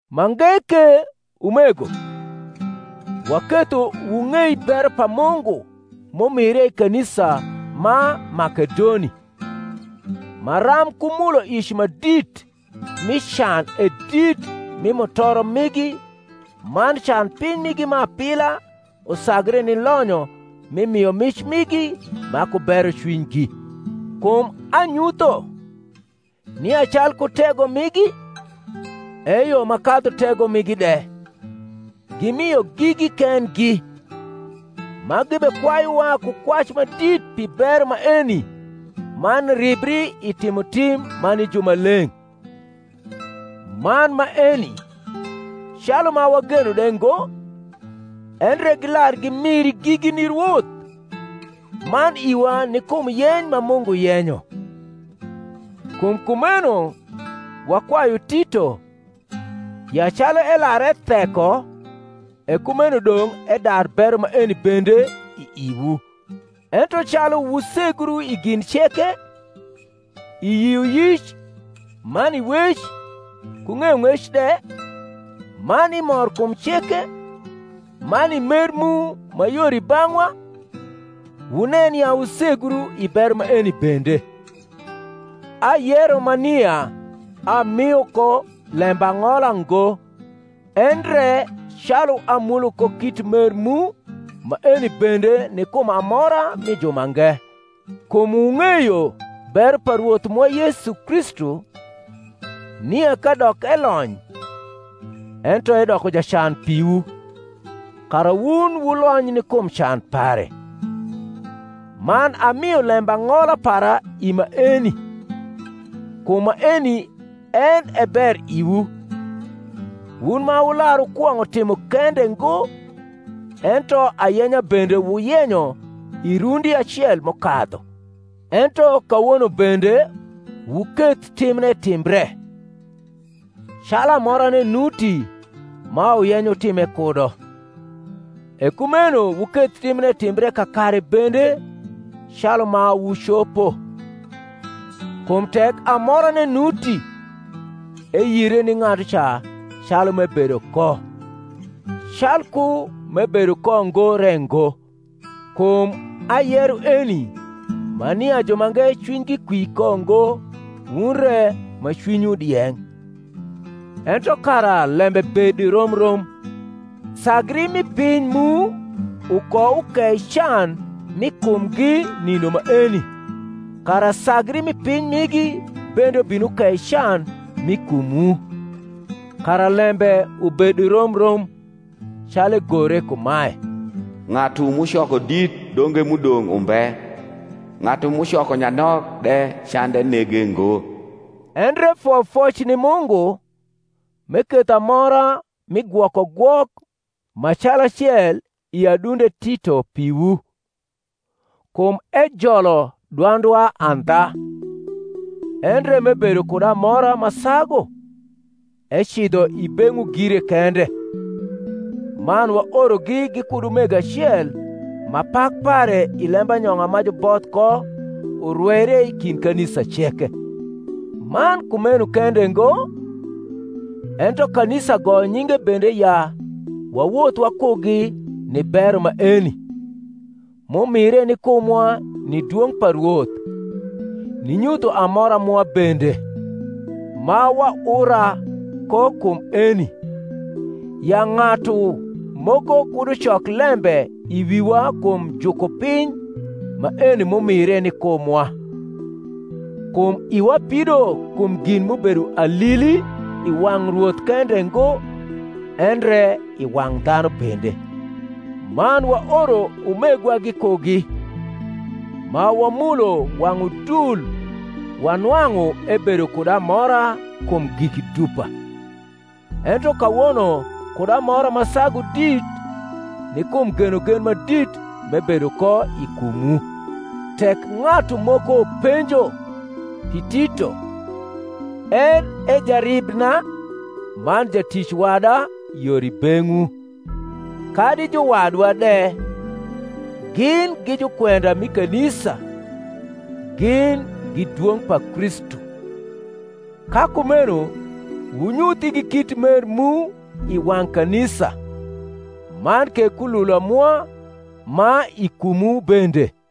Mange ke, umego, waketho wung’ei bero pa Mungu m’umire i kanisa ma Makedoni; maram ku muloic ma dit mi can e dit mi mutoro migi man can piny migi ma apila usagre ni lonyo mi miomic migi ma ku berocwinygi. Kum anyutho, nia calku tego migi, eyo ma kadhu tego migi de, gimio gigi kendgi, ma gibekwayuwa ku kwac ma dit pi bero maeni man ribri i timotim ma ni jumaleng’: man maeni, calu ma wageno de ngo, endre gilar gimiri gigi ni Rwoth, man iwa ni kum yeny ma Mungu yenyo. Kum kumeno wakwayu Tito, ya calu elar etheko, e kumeno dong’ edar bero maeni bende i iwu. Ento calu wusegru i gin ceke, i yioyic, man i wec, ku ng’eyong’ec de, man i morkum ceke, man i mer mu ma yor i bang’wa, wunen ya wusegru i bero maeni bende. Ayero ma nia amio ko lembang’ola ngo, endre calu amulo ko kit mer mu maeni bende ni kum amora mi jumange. Kum wung’eyo bero pa Rwoth mwa Yesu Kristu, nia kadok elony, ento edoko jacan piwu, kara wun wulony ni kum can pare. Man amio lembang’ola para i maeni: kum maeni en e ber iwu, wun ma wular wukwong’o timo kende ngo, ento ayenya bende wuyenyo i rundi acel m’ukadhu. Ento kawono bende wuketh timne timbre; calu amorane nuti ma wuyenyo wutime kudo, e kumeno wuketh timne timbre kakare bende calu ma wucopo. Kum tek amorane nuti, eyire ni ng’atuca calu m’ebedo ko, calku m’ebedo ko ngo re ngo. Kum ayero eni ma nia jumange cwinygi kwi ko ngo wun re ma cwinywu dieng’; ento kara lembe bed rom rom: sagri mi piny mu ukoukei can m’i kumgi nindo maeni, kara sagri mi piny migi bende ubin ukei can m’i kumwu; kara lembe ubed rom rom; calu egore kumae, Ng’atu m’ucoko dit donge m’udong’ umbe; ng’atu m’ucoko nyanok de cande nege ngo. Endre foyofoc ni Mungu, m’eketho amora mi gwokogwok ma calacel i adunde Tito piwu. Kum ejolo dwandwa andha; endre m’ebedo kud amora ma sagu, ecidho i beng’wu gire kende. man waorogi gikud umego acel ma pak pare i lembanyong’a ma juboth ko urweire i kind kanisa ceke; man kumeno kende ngo, ento kanisa goyo nyinge bende ya wawoth wakugi ni bero maeni, m’umire ni kumwa ni dwong’ pa Rwoth, ninyutho amora mwa bende: ma waura ko kum eni, ya ng’atu moko kud ucok lembe i wiwa kum jukupiny maeni m’umire ni kumwa: kum iwa pido kum gin m’ubedo alili i wang’ Rwoth kende ngo, endre i wang’ dhanu bende. Man waoro umegwa gikugi, ma wamulo wang’ udul wanwang’u ebedo kud amora kum giki dupa, ento kawono kud amora ma sagu dit, ni kum genogen ma dit m’ebedo ko i kumwu. Tek ng’atu moko penjo pi Tito, en e jaribna man jatic wada yor i beng’wu; kadi juwadwa de, gin gi jukwenda mi kanisa, gin gi dwong’ pa Kristu. Ka kumeno wunyuth igi kit mer mu i wang’ kanisa, man ke kulula mwa ma i kumwu bende.